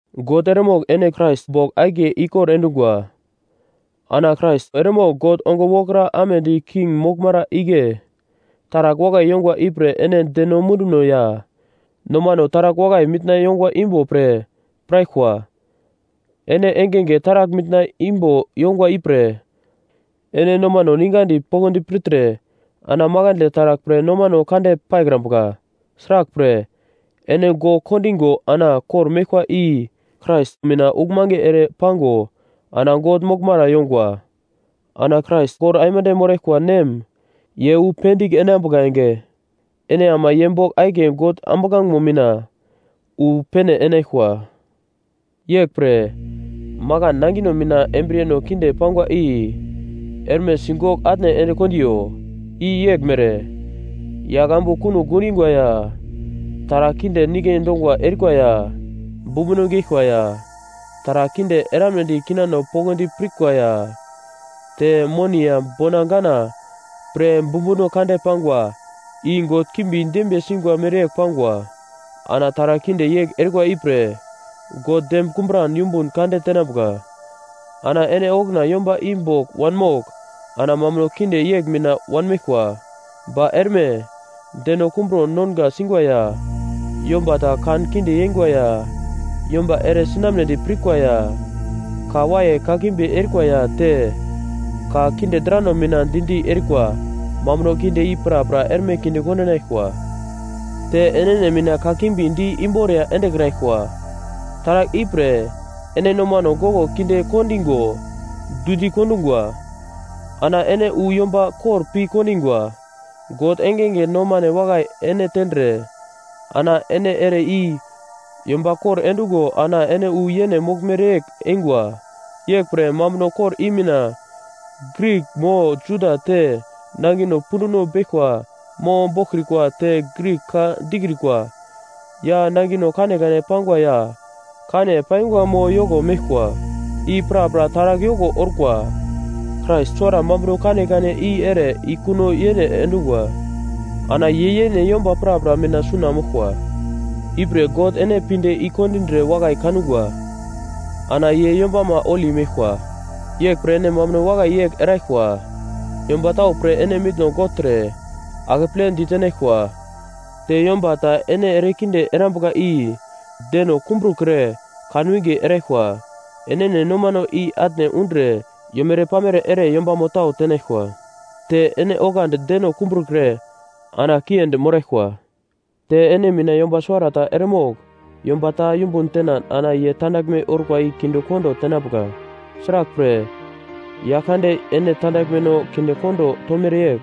God eremogl ene Krais bogl akiye ikor endungwa. Ana Krais eremogl God ongo wokra amedi king moglmara igle taragl wakai yongwa ipre ene deno munduno ya nomano taragl wakai mitna yongwa imbo pre piraglkwa. Ene engenge taragl mitna imbo yongwa ipre ene nomano ningadi poglodi pirtre ana makandle taragl pre nomano kande paikrambuka. Sraglpre, ene gogl kondingo ana kor-meglkwa i Krais mina uglmange ere pango ana God moglmara yongwa. Ana Krais kor aimande moraglkwa nem ye wu pendigl enambuka enge, ene ama ye bogl akiye God ambuglangemo mina wu pene enaglkwa. Yeglpre, makan nangino mina embriyeno kinde pangwa i erme sigogl atne ende kondiyo. I yeglmere: Yagl ambu kunogl gundingwa ya, taragl kinde nike dongwa erikwa ya, bumbuno geglkwa ya, taragl kinde eramnedi kinano poglodi pirkwa ya, te moni ya bona gana pre bumbuno kande pangwa, i god kimbi dembiye singwa mereyegl pangwa. Ana taragl kinde yegl erikwa ipre, God dem kumburan yumbun kande tenambuka. Ana ene okuna yomba i bogl wanmogl ana mambuno kinde yegl mina wanmeglkwa. Ba erme, deno kumbro nonga singwa ya, yomba ta kan kinde yeingwa ya, yomba ere sinambedi pirkwa ya, ka waiye kakimbi erikwa ya te, ka kinde drano mina di-di erikwa. Mambuno kinde i prapra erme kinde kondinaglkwa. Te enene mina kakimbi di imboriya endekraglkwa. Taragl ipre, ene nomano goglo kinde kondingo dundi kondungwa. Ana ene wu yomba kor pi kondingwa. God engenge nomane wakai ene tendre ana ene ere i yomba kor endungo ana ene wu yene moglmere yegl eingwa. Yeglpre mambuno kor i mina Grik mo Juda te nangino punduno beglkwa mo boglkrikwa te Grik ka dikrikwa ya nangino kanekane pangwa ya kane paingwa mo yoko meglkwa, i prapra taragl yoko orkwa. Krais suwara mambuno kanekane i ere i kuno yene endungwa. Ana ye yene yomba prapra mina suna moglkwa. Ipre God ene pinde i kondindre wakai kangwa ana ye yombama holi meglkwa. Yeglpre ene mambuno wakai yegl eraglkwa: Yomba tau pre ene mitno gogltre akeple ditenaglkwa, te yomba ta ene ere kinde erambuka i deno kumbrukre kan winge eraglkwa, enene nomano i atne undre yomere-pamere ere yombamo tau tenaglkwa, te ene oglandi deno kumbrukre ana kiendi moraglkwa. Te ene mina yomba suwarata eremogl yomba ta yumbun tenan ana ye tandaglme orkwa i kinde kondo tenambuka. Sraglpre, Yaglkande ene tandaglmeno kinde kondo tomere yegl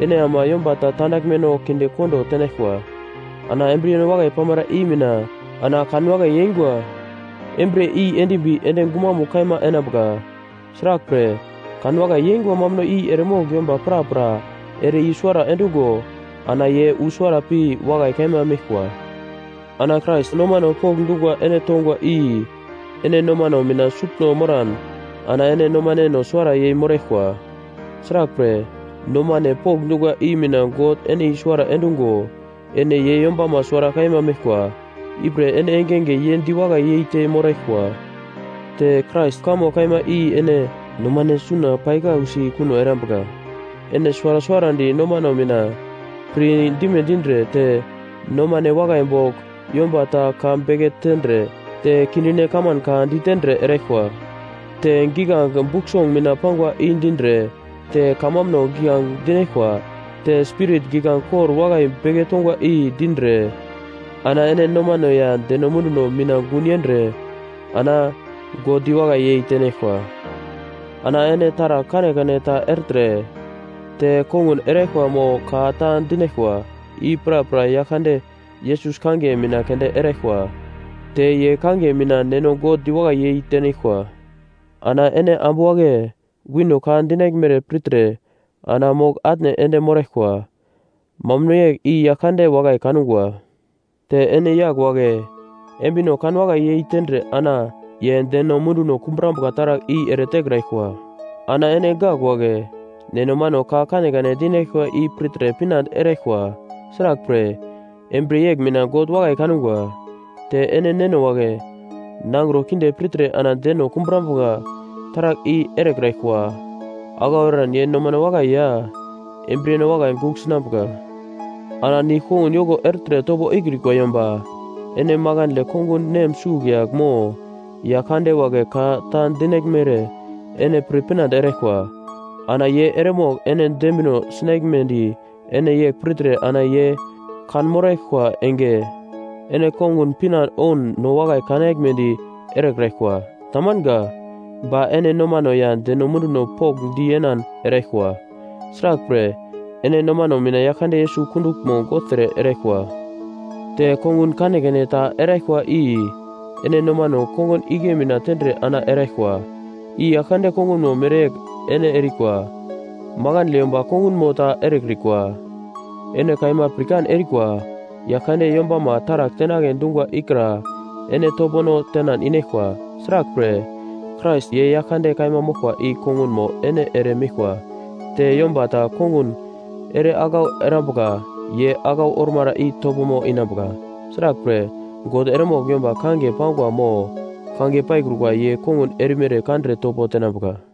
ene ama yomba ta tandaglmeno kinde kondo tenaglkwa. Ana embriyeno wakai pamara i mina ana kanwakai yeingwa embriye i endimbi ende gumamugl kaima enambuka, sraglpre, kanwakai yeingwa mambuno i eremogl yomba prapra ere i-suwara endungo ana ye wu suwara pi wakai kaima meglkwa. Ana Krais nomano pokndungwa ene tongwa i ene nomano mina sutno moran ana ene nomaneno suwara yei moraglkwa. Sraglpre nomane pokndungwa i mina God ene i-suwara endungo ene ye yombama suwara kaima meglkwa. Ipre ene engenge ye diwakai yeite moraglkwa. Te Krais kamo kaima i ene nomano suna pai kausi kuno erambuka. Ene suwara suwarandi nomano mina pir dime dindre te nomane wakai bogl yomba ta ka beke tendre te kindine kaman ka dindre eraglkwa. Te giglange Buk Song mina pangwa i dindre, te kamambuno giglange dinaglkwa, te Spirit giglange kor wakai beke tongwa i dindre, ana ene nomano ya deno munduno mina gun yendre ana God diwakai yei tenaglkwa. Ana ene taragl kanekane ta ertre te kongun eraglkwa mo ka ta dinaglkwa, i prapra Yaglkande Yesus kangiye mina keunde eraglkwa. Te ye kangiye mina Neno God diwakai yei tenaglkwa. Ana ene ambu wagle, wino ka dinaglmere pirtre ana mogl-atne ende moraglkwa, mambuno yegl i Yaglkande wakai kangwa. Te ene yagl wagle, embino kanwakai yei tendre ana ye deno munduno kumburambuka taragl i ere tekraglkwa. Ana ene gak wagle, neno mano ka kanekane dinaglkwa i pirtre pinande eraglkwa; sraglpre, embriye yegl mina God wakai kangwa. Te ene neno wagle, nangro kinde pirtre ana deno kumbrambuka taragl i erekraglkwa, aglau eran ye nomano wakai ya embriyeno wakai gugl sinambuka. Ana nigl-kongun yoko ertre topo ikrikwa yomba, ene makandle kongun nem sugl yagl mo yagl kande wagle ka ta dinaglmere ene pir pinande eraglkwa. Ana ye eremogl ene dembino sinaglmedi ene yegl pirtre ana ye kanmoraglkwa enge ene kongun pinande oun no wakai kanaglmedi erekraglkwa. Tamanga. Ba ene nomano ya deno munduno pokndi yenan eraglkwa; sraglpre, ene nomano mina Yaglkande Yesus kunduglmo gogltre eraglkwa. Te kongun kanekane ta eraglkwa i ene nomano kongun igle mina tendre ana eraglkwa. I Yaglkande kongunmo mereyegl ene erikwa. Makandle yomba kongunmo ta erekrikwa. Ene kaima pirkan erikwa, Yaglkande yombama taragl tenagledi dungwa ikra ene topono tenan inaglkwa. Sraglpre, Krais, ye Yaglkande kaima moglkwa i kongunmo ene ere meglkwa. Te yomba ta kongun ere aglau erambuka ye aglau ormara i topomo inambuka. Sraglpre, God eremogl yomba kangiye pangwa mo kangiye paikrukwa ye kongun erimere kandre topo tenambuka.